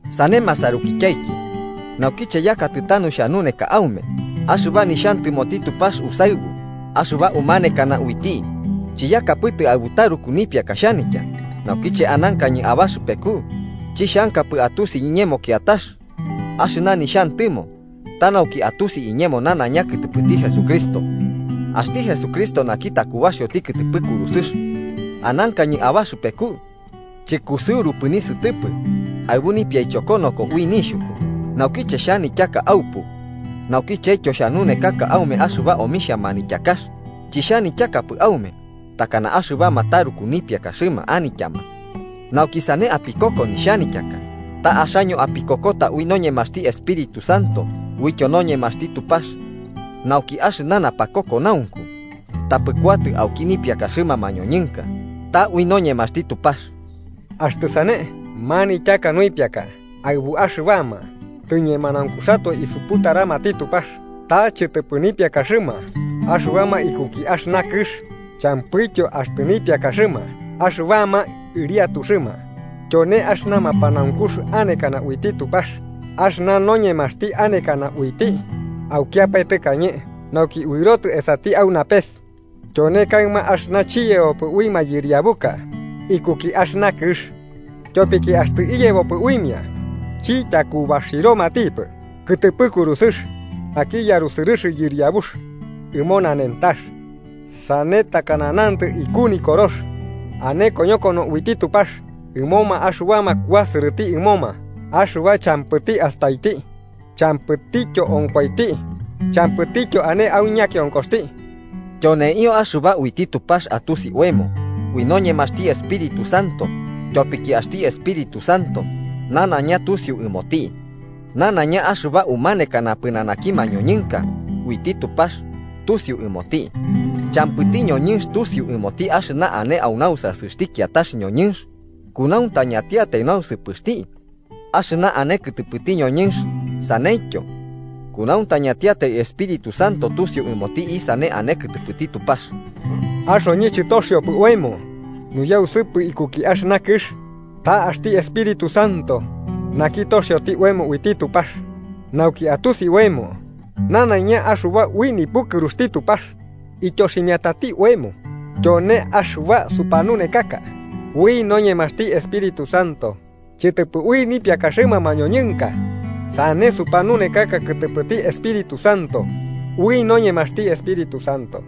Sane masarukityaiki, naukiche yakatɨ tanu xhanuneka aume axɨba nixhantɨmoti Tupax usaɨbu, axɨba umanekana uiti, chiyakapɨtɨ aɨbu taruku nipiaka xhanitya. Naukiche anankañɨ abaxɨpeku, chixhankapɨ atusi iñemo kiatax, axɨna nixhantɨmo ta nauki atusi iñemo nanaiña kɨtɨpɨti Jesucristo, axti Jesucristo naki takubaxioti kɨtɨpɨ kurusɨx. Anankañɨ abaxɨpeku chɨkusɨurupɨ nisɨtɨpɨ, aɨbu nipiaichokonoko ui nixhuku, naukiche xhanityaka aupu naukichetyo xhanunekaka aume axɨba omixhia manityakax, chixhanityakapɨ aume takana axɨbama taruku nipiakaxɨma anityama nauki sane apikoko nixhanityaka. Ta axaño apikokota ui noñemaxti Espíritu Santo uityo noñemaxti Tupax, nauki axɨna napakokonaunku tapɨ kuatɨ auki nipiakaxɨma mañoñɨnka, ta ui noñemaxti Tupax. Axtɨ sane, manityaka nuipiaka aɨbuma axɨbama tɨñemanaunkuxatoe isuputaramati Tupax. Ta chɨtɨpɨ nipiakaxɨma axɨbama ikuki axɨna kɨx, champɨityo axtɨ nipiakaxɨma axɨbama ɨriatuxɨma. Tyone axɨna mapanaunkux anekana uiti Tupax, axɨna noñemaxti anekana uiti, aukiapae tɨkañe nauki uɨrotɨ esati au napes. Tyone kaɨma axɨna chiyebopɨ ui mayɨriabuka ikuki axɨna kɨx, tyopiki axtɨ iyebopɨ uimia chityakubaxiromatipɨ kɨtɨpɨ kurusɨx naki yarusɨrɨx Yɨriabux ɨmo nanentax. Sane takana nantɨ iku Nikorox: “Ane koñokono uiti Tupax ɨmoma axɨbama kuasɨrɨti ɨmoma axɨba champɨti astaiti, champɨtityo onkoiti, champɨtityo ane au ñakionkoxti.” Tyoneio axɨba uiti Tupax atusi oemo ui noñemaxti Espíritu Santo, tyopiki axti Espíritu Santo nanaiña tusiu ɨmoti, nanaiña axɨba umanekana pɨnanaki mañoñɨnka uiti Tupax tusiu ɨmoti. Champɨti ñoñɨnx tusiu ɨmoti axɨna ane au nausasɨxti kiatax ñoñɨnx, kunauntañatiatai nausɨpɨxti axɨna ane kɨtɨpɨti ñoñɨnx. Saneityo, kunauntañatiatai Espíritu Santo tusiu ɨmoti isane ane kɨtɨpɨti Tupax. Axoñɨ chɨtoxiopɨ oemo nuyausɨpɨ ikuki axɨna kɨx, ta axti Espíritu Santo naki toxioti oemo uiti Tupax, nauki atusi oemo nanaiña axɨba ui nipukɨruxti Tupax ityoximiatati oemo. Tyone axɨba supanunekaka ui noñemaxti Espíritu Santo, chɨtɨpɨ ui nipiakaxɨma mañoñɨnka. Sane supanunekaka kɨtɨpɨti Espíritu Santo ui noñemaxti Espíritu Santo.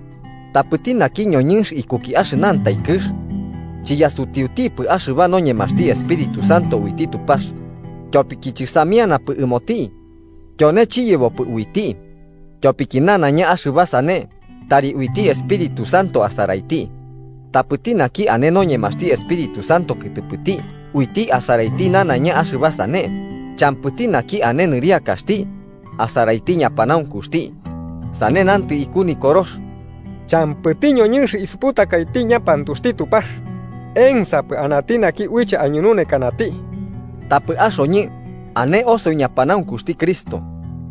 Tapɨti naki ñoñɨnx ikuki axɨnantai kɨx, chiyasutiutipɨ axɨba noñemaxti Espíritu Santo uiti Tupax, tyopiki chɨsamianapɨ ɨmoti. Tyone chiyebopɨ uiti, tyopiki nanaiña axɨba sane tari uiti Espíritu Santo asaraiti. Tapɨti naki ane noñemaxti Espíritu Santo kɨtɨpɨti uiti asaraiti nanaiña axɨba sane, champɨti naki ane nɨriakaxti asaraiti ñapanaunkuxti. Sane nantɨ iku Nikorox: “Champɨti ñoñɨnx isuputakaiti ñapanaunkuxti Tupax. ¿Ensapɨ anati naki uiche aiñununekanati?” Tapɨ axoñɨ, ane osoi ñapanaunkuxti Cristo.